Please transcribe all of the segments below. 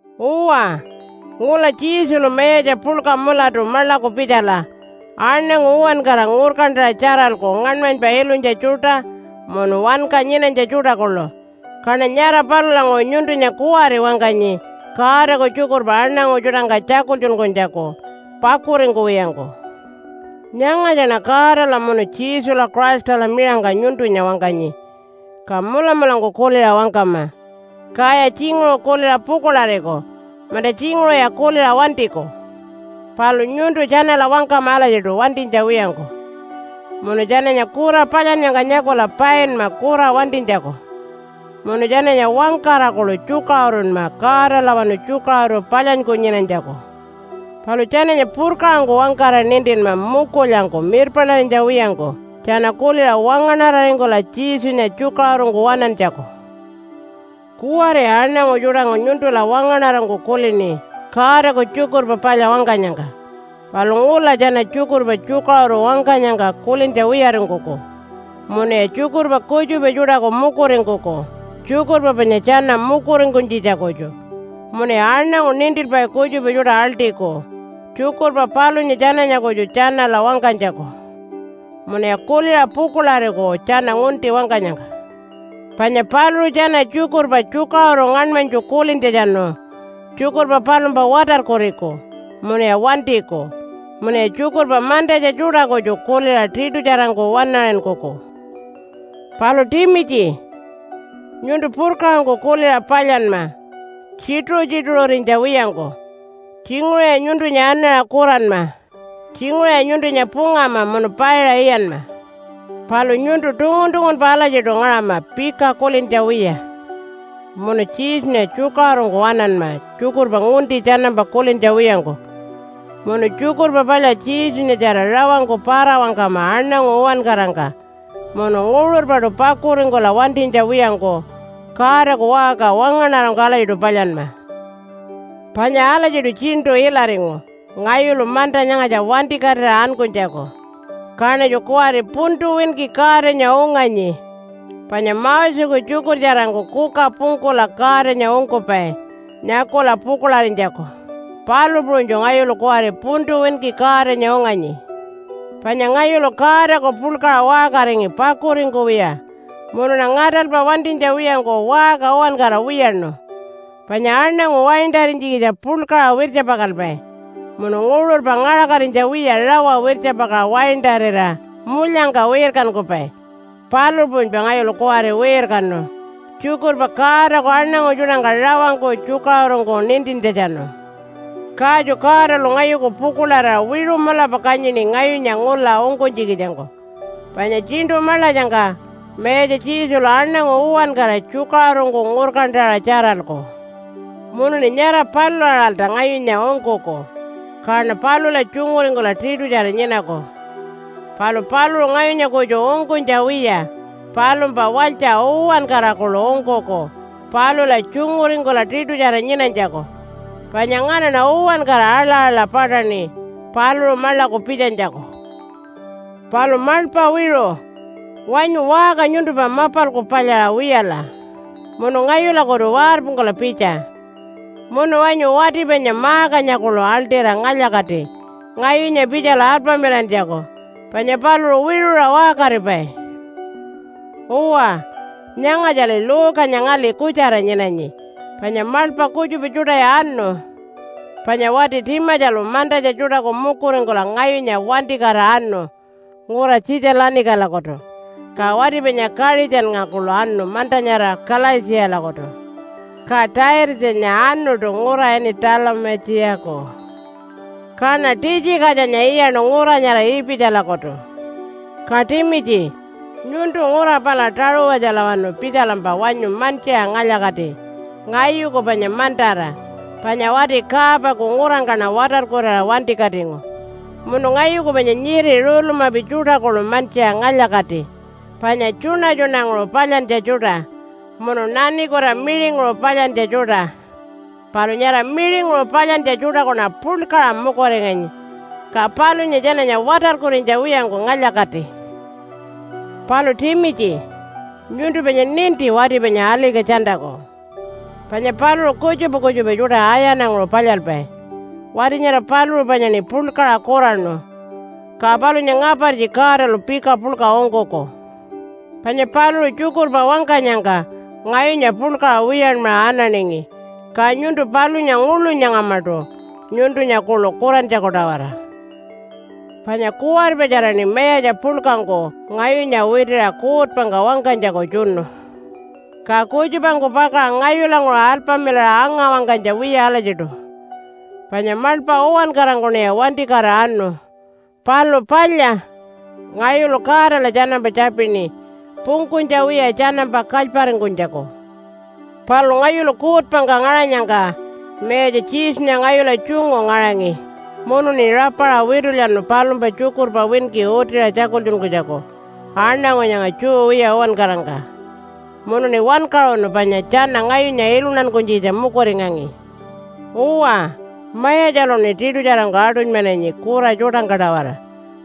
Uwa, ngula Jesulu mayatja puḻka mulatu maḻaku pitjala aṉangu uwankara ngurkantaṟa tjaralku ngaṉmanypa ilunytja tjuṯa munu wanka nyinanytja tjuṯa kuḻu. Kaṉa nyara palulanguṟu nyuntunya kuwari wangkanyi Godaku tjukurpa aṉangu tjuṯangka tjakultjunkunytjaku pakuringkuwiyangku. Nyangatjaṉa Godala munu Jesula Christala miṟangka nyuntunya wangkanyi, ka mulamulangku kuliṟa wangkama. Kaya tjinguṟu kuliṟa pukuḻariku, munta tjinguṟuya kuliṟa wantiku. Palu nyuntu tjanala wangkama alatjiṯu wantinytja wiyangku. Munu tjananya kura palyannyangka nyakula painma kura wantinytjaku, munu tjananya wangkara kuḻu tjukaṟurunma Godalawanu tjukaṟuru palyanyku nyinanytjaku. Palu tjananya purkaṟangku wangkara nintinma mukulyangku mirpaṉarinytja wiyangku tjana kuliṟa wangaṉararingkula Jesunya tjukaṟurungku waṉantjaku. Kuwariya aṉangu tjuṯangku nyuntula wangaṉarangku kulini Godaku Tjukurpa Palya wangkanyangka. Palu ngula tjana tjukurpa tjukaṟuru wangkanyangka kulintja wiyaringkuku munuya tjukurpa kutjupa tjuṯaku mukuringkuku tjukurpa panya tjana mukuringkunytjitjaku kutju, munuya aṉangu nintilpai kutjupa tjuṯa aḻṯiku tjukurpa palunya tjananya kutju tjanala wangkanytjaku. Munuya kuliṟa pukuḻariku tjana ngunti wangkanyangka. Panya paluṟu tjana tjukurpa tjukaṟuru ngaṉmanytju kulintjatjanu tjukurpa palumpa watarkuriku munuya wantiku, munuya tjukurpa mantatja tjuṯa kutju kuliṟa tiṯutjarangku waṉaṟinkuku. Palu Timitji, nyuntu purkaṟangku kuliṟa palyanma tjituṟu-tjituṟurinytja wiyangku. Tjinguṟuya nyuntunya anaṟa kuranma, tjinguṟuya nyuntunya pungama munu paiṟa iyanma. Palu nyuntu tungun-tungunpa alatjiṯu ngaṟama pika kulintja wiya, munu Jesunya tjukaṟurungku waṉanma tjukurpa ngunti tjanampa kulintja wiyangku. Munu Tjukurpa Palya Jesunyatjara rawangku para-wangkama aṉangu uwankarangka munu nguṟurpaṯu pakuringkula wantinytja wiyangku Godaku waṟka wangaṉarangku alatjiṯu palyanma. Panya alatjiṯu tjiṉṯu ilaringu ngayulu manta nyangatja wantikatira ankunytjaku. Kaṉatju kuwari puntu winki Godanya unganyi, panya Moseku tjukurtjarangku kuka pungkula Godanya ungkupai nyakula pukuḻarinytjaku, palu puṟunytju ngayulu kuwari puntu winki Godanya unganyi. Panya ngayulu Godaku puḻkaṟa waṟkaringi pakuringkuwiya munuṉa ngaṯalpa wantinytja wiyangku waṟka uwankara wiyaṉu. Panya aṉangu waintarinytjikitja puḻkaṟa wirtjapakalpai munu nguṟurpa ngaṟakatinytja wiya rawa wirtjapakaṟa waintarira mulyangka wirkankupai, palu puṟunypa ngayulu kuwari wirkanu, tjukurpa Godaku aṉangu tjuṯangka rawangku tjukaṟurungku nintintjatjanu. Katju Godalu ngayuku pukuḻarira wiṟu mulapa kanyini ngayunya ngula ungkunytjikitjangku. Panya Tjiṉṯu Maḻatjangka Mayatja Jesulu aṉangu uwankara tjukaṟurungku ngurkantaṟa tjaralku. Munuṉi nyara palula-aṟalta ngayunya ungkuku, kaṉa palula tjunguringkula tiṯutjara nyinaku. Palu paluṟu ngayunya kutju ungkunytja wiya palumpa walytja uwankara kuḻu ungkuku palula tjunguringkula tiṯutjara nyinanytjaku. Panya nganaṉa uwankara aḻa-aḻa paṯaṉi paluṟu maḻaku pitjanytjaku. Palu maḻpa wiṟu, wanyu waṟka nyuntumpa mapalku palyaṟa wiyala munu ngayulakutu warpungkula pitja. Munu wanyu wati panya Markanya kuḻu aḻṯira ngalya-kati ngayunya pitjala alpamilantjaku, panya paluṟu wiṟuṟa waṟkaripai. Uwa, nyangatjali Luke-anya ngali kutjara nyinanyi panya maḻpa kutjupa tjuṯaya anu. Panya wati Timatjalu mantatja tjuṯaku mukuringkula ngayunya wantikatira anu ngura Tjitja-lanikalakutu, ka wati panya Kaṟitjannga kuḻu anu manta nyara Kalaitjiyalakutu. Ka Taitatjanya anuṯu ngura ini Talumai-tjiyaku. Kaṉa Titjikatjanya iyaṉu ngura nyara Ipitjalakutu. Ka Timitji, nyuntu ngura pala Taṟuwatjalawanu pitjalampa wanyu mantjiṟa ngalya-kati ngayuku panya mantara, panya wati Kaapaku ngurangkaṉa watarkurira wantikatingu. Munu ngayuku panya nyiri rulumapi tjuṯa kuḻu mantjiṟa ngalya-kati, panya tjuṉa-tjuṉanguṟu palyantja tjuṯa munu nanikuta miṟinguṟu palyantja tjuṯa. Palu nyara miṟinguṟu palyantja tjuṯakuṉa puḻkaṟa mukuringanyi, ka palunya tjananya watarkurinytja wiyangku ngalya-kati. Palu Timitji, nyuntu panya ninti wati panya Alika-tjantaku. Panya paluṟu kutjupa kutjupa tjuṯa ayananguṟu palyalpai. Wati nyara paluṟu panyaṉi puḻkaṟa kuraṉu. Ka palunya ngapartji Godalu pika puḻka ungkuku. Panya paluṟu tjukurpa wangkanyangka ngayunya puḻkaṟa wiyanmaṟa ananingi. Ka nyuntu palunya nguḻu nyangamaṯu nyuntunya kuḻu kurantjaku-tawara. Panya kuwaripatjaraṉi mayatja puḻkangku ngayunya witiṟa kuutpangka wangkanytjaku tjunu, ka kutjupangku pakaṟa ngayulanguṟu alpamilaṟa anga-wangkanytja wiya alatjiṯu. Panya maḻpa uwankarangkuṉiya wantikatira anu. Palu palya, ngayulu Godala tjanampa tjapini pungkunytja wiya tjanampa kalyparingkunytjaku. Palu ngayulu kuutpangka ngaṟanyangka Mayatja Jesunya ngayula tjungu ngaṟangi, munuṉi rapaṟa witulyanu palumpa tjukurpa winki utiṟa tjakultjunkunytjaku aṉangu nyanga Jew wiya uwankarangka. Munuṉi wankaṟunu, panya tjana ngayunya iluntankunytjikitja mukuringangi. Uwa, Mayatjaluṉi tiṯutjarangku aṯunymananyi kura tjuṯangka-tawara,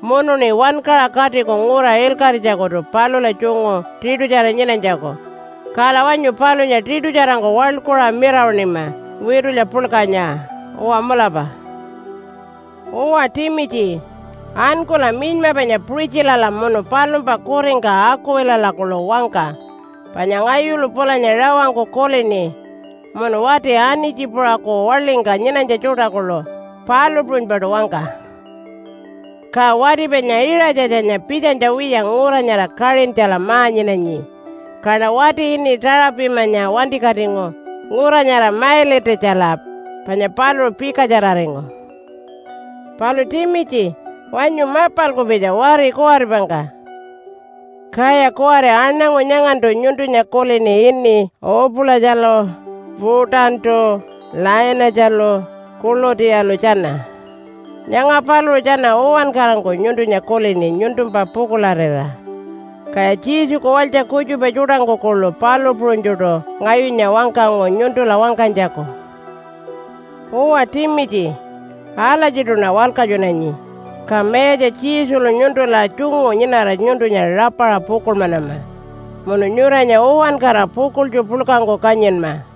munuṉi wankaṟa katiku ngura ilkaṟitjakutu palula tjungu tiṯutjara nyinanytjaku. Kala wanyu palunya tiṯutjarangku waḻkuṟa mirawaṉima witulya puḻkanya. Uwa mulapa. Uwa Timitji, ankula minyma panya Puṟitjilala munu palumpa kuringka Akuwilala kuḻu wangka panya ngayulu pulanya rawangku kulini. Munu wati Anitji-puṟaku waḻingka nyinanytja tjuṯa kuḻu palu puṟunypaṯu wangka. Ka wati panya Iṟatjatjanya pitjanytja wiya ngura nyara Kaṟintjala ma-nyinanyi. Kaṉa wati ini Tuṟu-pimatjanya wantikatingu ngura nyara Mailitatjala, panya paluṟu pikatjararingu. Palu Timitji, wanyu mapalku pitja wari kuwaripangka. Kaya kuwari aṉangu nyangantu nyuntunya kulini ini Upu-latjalu, Putantu, Lainatjalu, Kulutiyalu tjana. Nyanga paluṟu tjana uwankarangku nyuntunya kulini nyuntumpa pukuḻarira. Kaya Jesuku walytja kutjupa tjuṯangku kuḻu palu puṟunytjuṯu ngayunya wangkangu nyuntula wangkanytjaku. Uwa Timitji, alatjiṯuṉa walkatjunanyi. Ka Mayatja Jesulu nyuntula tjungu nyinara nyuntunya rapaṟa pukuḻmanama, munu nyuranya uwankara pukuḻtju puḻkangku kanyinma.